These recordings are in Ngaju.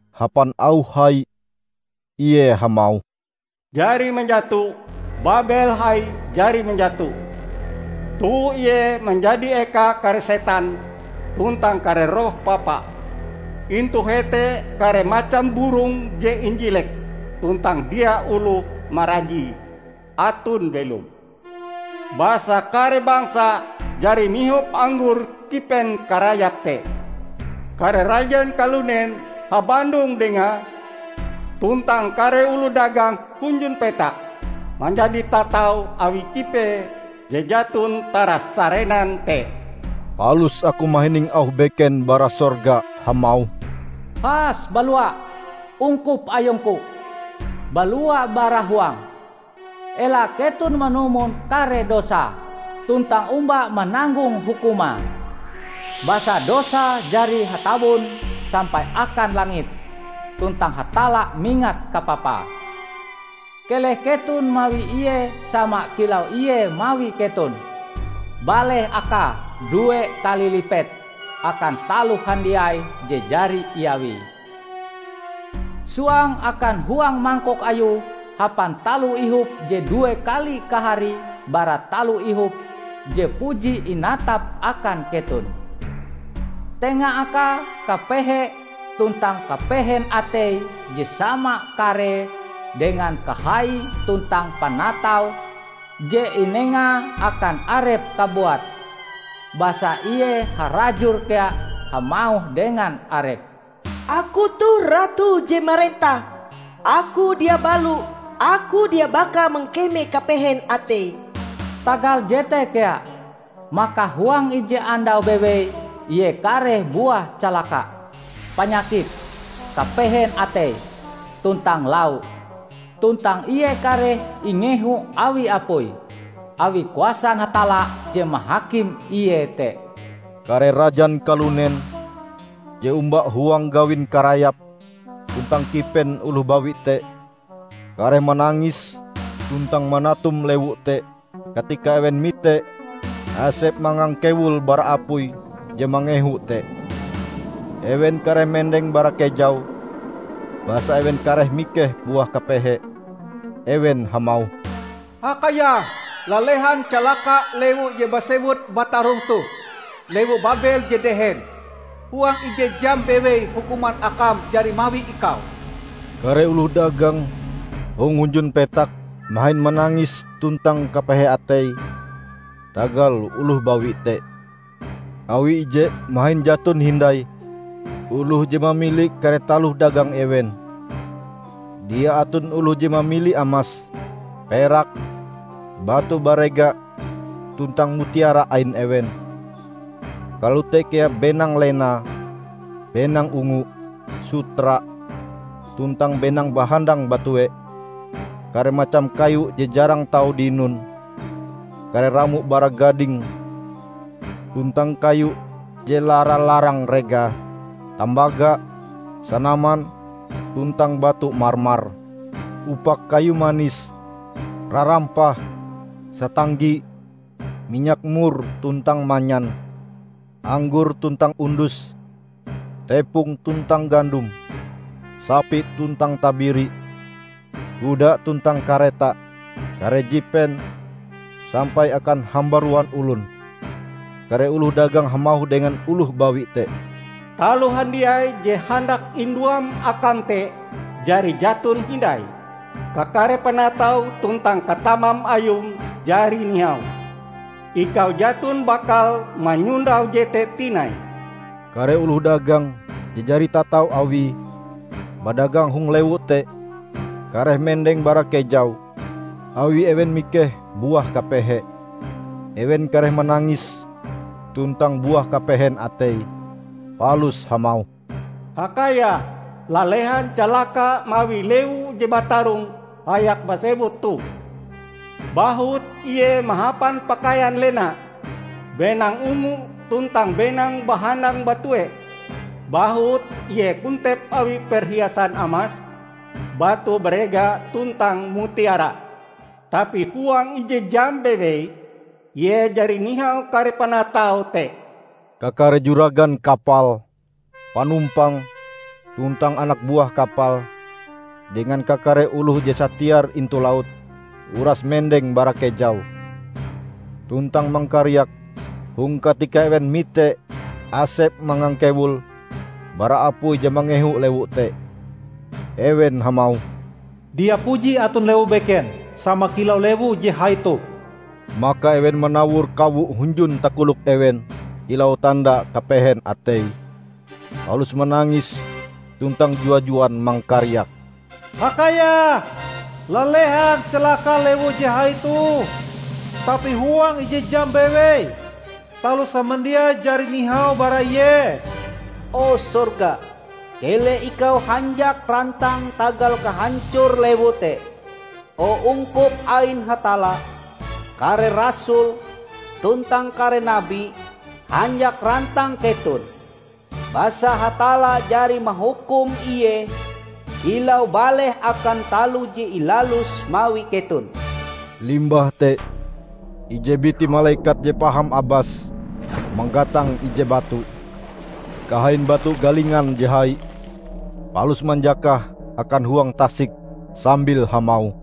Hapan auh hai, ie hamauh, "Jari manjato! Babel hai jari manjato! Toh ie manjadi eka kare setan tuntang kare roh papa. Intu hete kare macam burong je injilek tuntang dia oloh marajie, aton belom. Basa kare bangsa jari mihop anggor kipen karayape te. Kare rajan kalunen habandong dengae, tuntang kare oloh dagang hunjun petak manjadi tatau awi kipee je jaton tarasarenan te." Palus aku mahining auh beken bara sorga hamauh, "Has balua, ungkup Ayungku! Balua bara huange! Ela keton manumon kare dosae, tuntang omba mananggong hukumae! Basa dosae jari hatawon sampai akan langit, tuntang Hatalla mingat kapapae. Keleh keton mawi ie sama kilau ie mawi keton; baleh akae due kali lipet akan taloh handiai je jari iawie. Suang akan huang mangkok ayue hapan taloh ihop je due kali kaharie bara taloh ihop je puji inatape akan keton. Tenga akae kapehe tuntang kapehen atei je sama karee dengan kahai tuntang panatau je inengae akan arepe kabuat. Basa ie harajur kea hamauh dengan arepe, 'Aku toh ratu je marentah! Aku dia balo; Aku dia baka mangkeme kapehen atei!' Tagal jete kea, maka huang ije andau bewei ie kareh buah calaka -- panyakit, kapehen atei, tuntang lau. Tuntang ie kareh ingehu awi apui, awi kuasan Hatalla je mahakim ie te." Kare rajan kalunen je omba huang gawin karayap tuntang kipen oloh bawi te kareh manangis tuntang manatum lewu te katika ewen mite asep mangangkewul bara apui je mangehu te. Ewen kareh mendeng bara kejau basa ewen kareh mikeh buah kapehee. Ewen hamauh, "Hakayah, lalehan calaka lewu je basewut batarong toh -- lewu Babel je dehen! Huang ije jam bewei hukuman akam jari mawi ikau!" Kare oloh dagang hong hunjun petak mahin manangis tuntang kapehe atei tagal oloh bawi te, awi ije mahin jaton hindai oloh je mamili kare taloh dagang ewen. Dia aton oloh je mamili amas, perak, batu barega tuntang mutiara ain ewen; kalote kea benang lena, benang ungu, sutra, tuntang benang bahandang batue; kare macam kayu je jarang tau dinon, kare ramo bara gading tuntang kayu je lara-larang regae, tambaga, sanaman, tuntang batu marmar; upak kayu manis, rarampah, satanggi, minyak mur tuntang manyan; anggor tuntang undus, tepong tuntang gandom; sapi tuntang tabiri, kuda tuntang kareta, kare jipen, sampai akan hambaruan olon. Kare oloh dagang hamauh dengan oloh bawi te, "Taloh handiai je handak induam akam te jari jaton hindai, kakare panatau tuntang katamam ayum jari nihau. Ikau jaton bakal manyondau jete tinai!" Kare oloh dagang je jari tatau awie badagang hong lewu te kareh mendeng bara kejau, awi ewen mikeh buah kapehee. Ewen kareh manangis tuntang buah kapehen atei, palus hamauh, "Hakayah, lalehan calaka mawi lewu je batarong hayak basewut toh! Bahut ie mahapan pakaian lena, benang ungu tuntang benang bahandang batue; bahut ie kontep awi perhiasan amas, batu barega tuntang mutiara! Tapi huang ije jam bewei, ie jari nihau kare panataue te!" Kakare juragan kapal, panumpang, tuntang anak buah kapal, dengan kakare oloh je satiar intu laut, uras mendeng bara kejau. Tuntang mangkariak hong katika ewen mite asep mangangkewul bara apui je mangehu lewu te. Ewen hamauh, "Dia puji aton lewu beken sama kilau lewu je hai toh!" Maka ewen manawor kawo hunjun takolok ewen kilau tanda kapehen atei, palus manangis tuntang jua-juan mangkariak, "Hakayah, lalehan calaka lewu je hai toh! Tapi huang ije jam bewei, taloh samandiai jari nihau bara ie!" O sorga, keleh ikau hanjak rantang tagal kahancor lewu te! O ungkup ain Hatalla, kare rasul, tuntang kare nabi, hanjak rantang keton! Basa Hatalla jari mahukum ie kilau baleh akan taloh je ilaluse mawi keton! Limbah te, ije biti malekat je paham abas manggatang ije batu -- kahain batu galingan je hai -- palus manjakahe akan huang tasik sambil hamauh,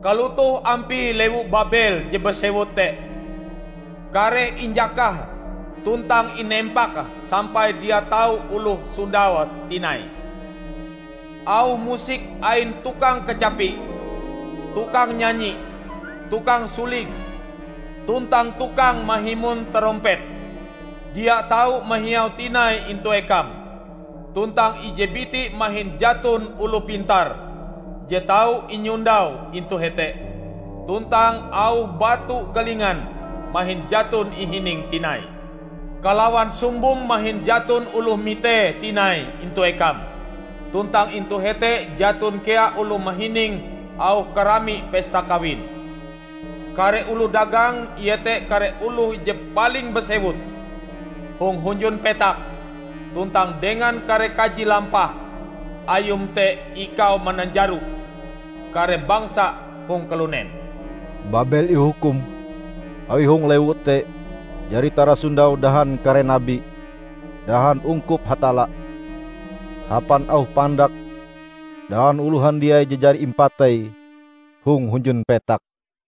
"Kalotoh ampie lewu Babel je basewut te kareh injakahe tuntang inempak sampai dia tau oloh sondaue tinai. Auh musik ain tukang kacapi, tukang nyanyi, tukang suling, tuntang tukang mahimon tarompet, dia tau mahiau tinai intu ekam! Tuntang ije biti mahin jaton oloh pintar je tau inyondau intu hete, tuntang auh batu galingan mahin jaton ihining tinai. Kalawan sumbom mahin jaton oloh mitee tinai intu ekam; tuntang intu hete jaton kea oloh mahining auh karami pesta kawin. Kare oloh dagang iete kare oloh je paling basewut hong hunjun petak, tuntang dengan kare kaji lampah ayum te ikau mananjaro kare bangsa hong kalunen!" Babel ihukum awi hong lewu te jari tarasondau dahan kare nabi, dahan ungkup Hatalla -- hapan auh pandak dahan oloh handiai je jari impatei hong hunjun petak.